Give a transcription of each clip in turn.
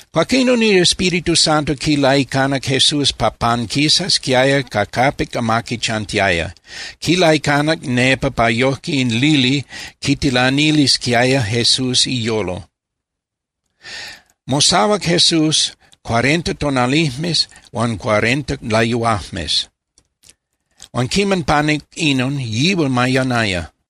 Cuaquinon in Espíritu Santo quilaicanac Jesús pa panquisasquiaya ca capic amaqui chantiaya. Quilaicanac nepa pa yojque in lili quitilanilisquiaya Jesús iyolo. Mosahuac Jesús cuarenta tonalijmes huan cuarenta layuajmes, huan quiman panuc inon, yihual mayanaya.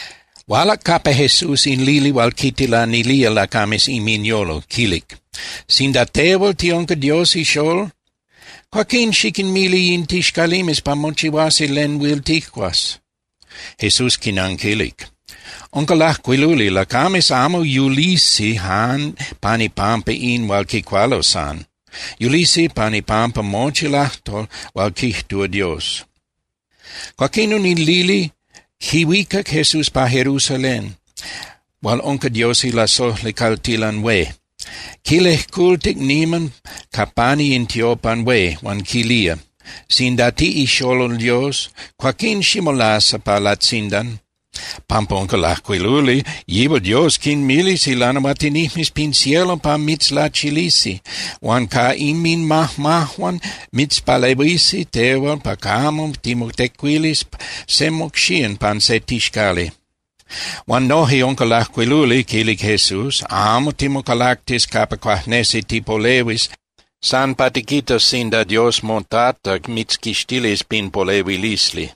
Hualac capa Jesús in lili hual quintilanilía lacames inminyolo, quilic: —Sinda tehual tiunca Dios ixolol, cuaquín xiquinmili in tixcalimes pa mochihuasi len huil tijcuas. Jesús quinanquilic: —Unca lajcuiluli: “Lacames amo yulisi jan pan ipampa in hual quicualo san. Yulisi pan ipampa mochi lajtol hual quijtúa Dios.” Cuaquinon in lili quihuicac Jesús pa Jerusalén hual unca Dios ilasojli caltilan hué, quilejcultic niman ca pani in tiopan hué. Huan quilía: —Sinda tiꞌixolol Dios, cuaquín ximolasa pa latzindan, pampa unca lajcuiluli: Yihual Dios quinmilis ilanahuatinijmes pin cielo pa mitzlachilisi. Huan ca inmajmajuan mitzpalehuisi tehual pa camo timotecuilis se mocxían pan se tixcali. —Huan noje unca lajcuiluli —quilic Jesús—: “Amo timocalactis capa cuajnesi tipolehuis san pa tiquitas sinda Dios moTata mitzquixtilis pin polehuilisli.”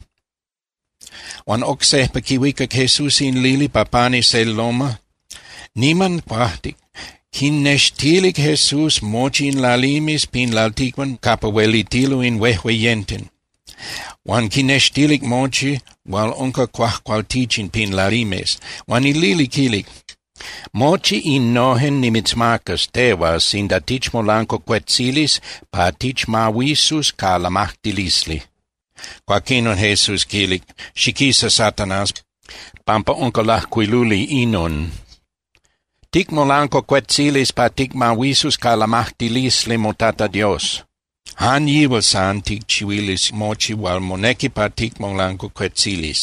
Huan oc sejpa quihuicac Jesús in lili pa pani se loma (tepel) niman cuajtic. Quinextilic Jesús mochi in lalimes pin lalticpan capa huelitilo in huejueyenten, huan quinextilic mochi hual unca cuajcualtichin pin lalimes. Huan in lili quilic: —Mochi innojen nimitzmacas tehual sinda tichmolancuacuetzilis pa tichmahuisus ca lamajtilisli. Cuaquinon Jesús quilic: —Xiquisa, Satanás, pampa unca lajcuiluli inon: “Ticmolancuacuetzilis pa ticmahuisus ca lamajtilisli moTata Dios. Jan Yihual san ticchihuilis mochi hual monequi pa ticmolancuacuetzilis.”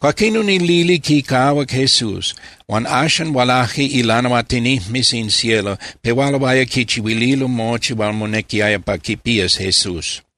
Cuaquinon in lili quicahuac Jesús. Huan axan hualaje ilanahuatinijmes in cielo, pehualoaya quichihuililo mochi hual monequiaya pa quipías Jesús.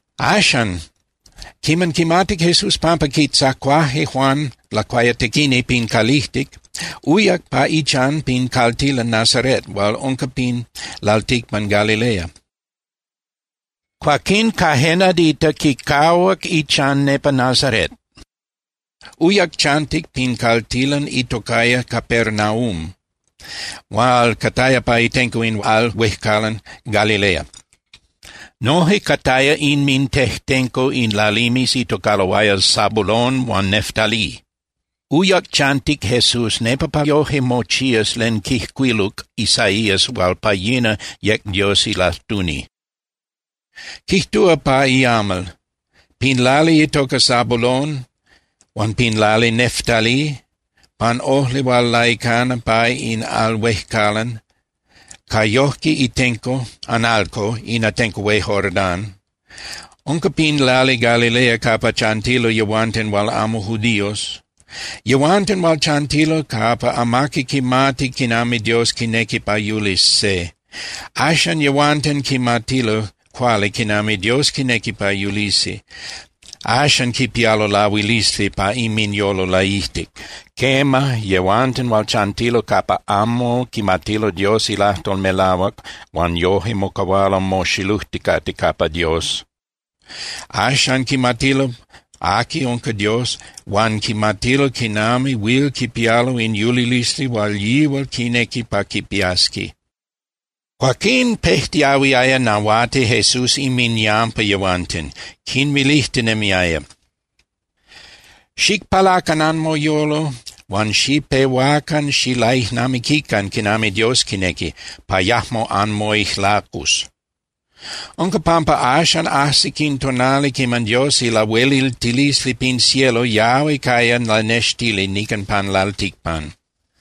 Axan, quiman quimatic Jesús pampa quitzacuaje Juan Lacuayatequini pin calijtic, uyac pa ichan pin caltilan Nazaret hual unca pin lalticpan Galilea. Cuaquín ca je nadita quicahuac ichan nepa Nazaret, uyac chantic pin caltilan itocaya Capernaum hual cataya pa itenco in al huejcalan Galilea. Noje cataya inmintejtenco in lalimes itocaloaya Zabulón huan Neftalí. Uyac chantic Jesús nepa pa yoje mochías len quijcuiluc Isaías hual pa yina yec Dios ilajtuni. Quijtúa pa iamal: Pin lali itoca Zabulón, huan pin lali Neftalí, pan ojli hual laicana pa in al huejcalan, ca yojque itenco (analco) in atenco hué Jordán, unca pin lali Galilea capa chantilo yehuanten hual amo judíos. Yehuanten hual chantilo capa amaqui quimati quinami Dios quinequi pa yulis se, axan yehuanten quimatilo cuali quinami Dios quinequi pa yulisi, axan quipialo lahuilisli pa inminyolo laijtic. Quema, yehuanten hual chantilo capa amo quimatilo Dios ilajtol melahuac huan yoje mocahualo moxilujticate capa Dios, axan quimatilo aqui unca Dios huan quimatilo quinami huil quipialo in yulilisli hual yihual quinequi pa quipiasqui. Cuaquín pejtiahuiaya nahuati Jesús inminyampa yehuanten, quinmilijtinemiaya: —Xicpalacan anmoyolo huan xipehuacan xilaijnamiquican quinami Dios quinequi, pa yajmo anmoijlacus. Unca pampa axan ajsic in tonali quiman Dios ilahueliltilisli pin cielo yahui caya lanextili nican pan lalticpan.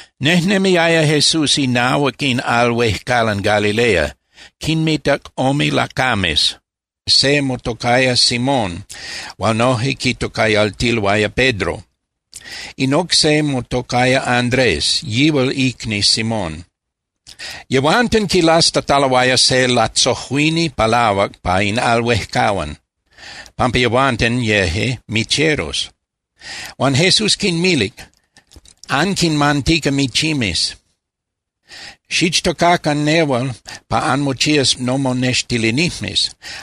Nejnemiaya Jesús inahuac in al huejcalan Galilea. Quinmitac ome lacames, se motocaya Simón hual noje quitocayaltiloaya Pedro. In oc se motocaya Andrés, yihual icni Simón. Yehuanten quilastataloaya se latzojuini palahuac pa in al huejcalan, pampa yehuanten yeje micheros. Huan Jesús quinmilic: —Anquinmantica michimes. Xichtocacan nehual pa anmochías nomonextilinijmes.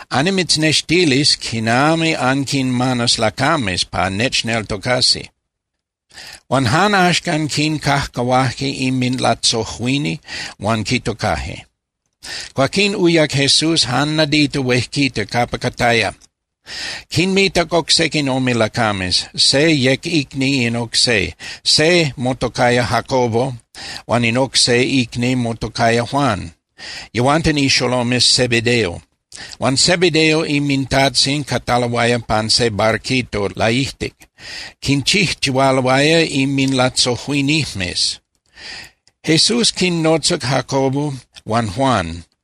Annimitznextilis quinami anquinmanas lacames pa nechneltocasi. Huan jan axcan quincajcahuaje inminlatzojuini huan quitocaje. Cuaquín uyac Jesús jan nadita huejquita capa cataya. Quinmitac oc sequin ome lacames. Se yec icni in oc se. Se motocaya Jacobo huan in oc se icni motocaya Juan, yehuanten ixolomes Zebedeo. Huan Zebedeo inmintajtzin cataloaya pan se barquito laijtic, quinchijchihualoaya inminlatzojuinijmes. Jesús quinnotzac Jacobo huan Juan.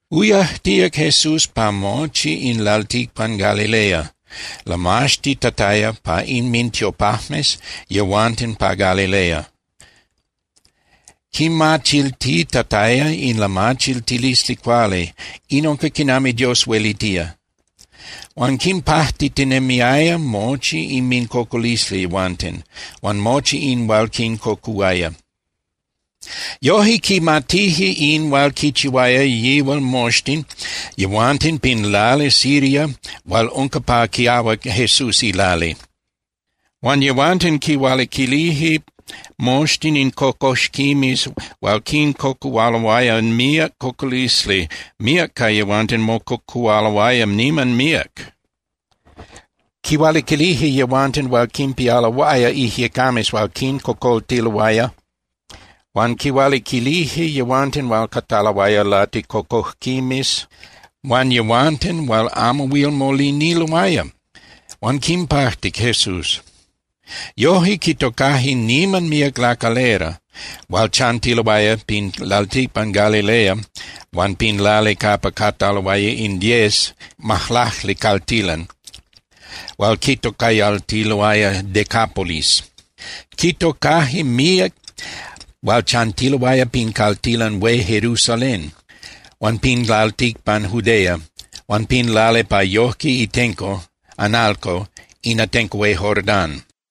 Uyajtíac Jesús pa mochi in lalticpan Galilea, lamaxtitataya pa inmintiopajmes yehuanten pa Galilea. Quimachiltitataya in lamachiltilisli cuali, in unca quinami Dios huelitía. Huan quinpajtitinemiaya mochi inmincocolisli yehuanten, huan mochi in hual quincocuhuaya. Yoje quimatije in hual quichihuaya yihual moxtin yehuanten pin lali Siria hual unca pa quiahuac Jesús ilali. Huan yehuanten quihualiquilije moxtin in cocoxquimes hual quincocuhualoaya míac cocolisli, míac ca yehuanten mococuhualoaya niman míac. Quihualiquilije yehuanten hual quinpialoaya ijyecames hual quincocoltiloaya huan quihualiquilije yehuanten hual cataloaya laticocojquimes huan yehuanten hual amo huil moliniloaya. Huan quinpajtic Jesús. Yoje quitocaje niman míac lacalera hual chantiloaya pin lalticpan Galilea huan pin lali capa cataloaya in diez (majlacli) caltilan hual quitocayaltiloaya Decápolis. Quitocaje míac hual chantiloaya pin caltilan hué Jerusalén huan pin lalticpan Judea huan pin lali pa yojque itenco (analco) in atenco hué Jordán.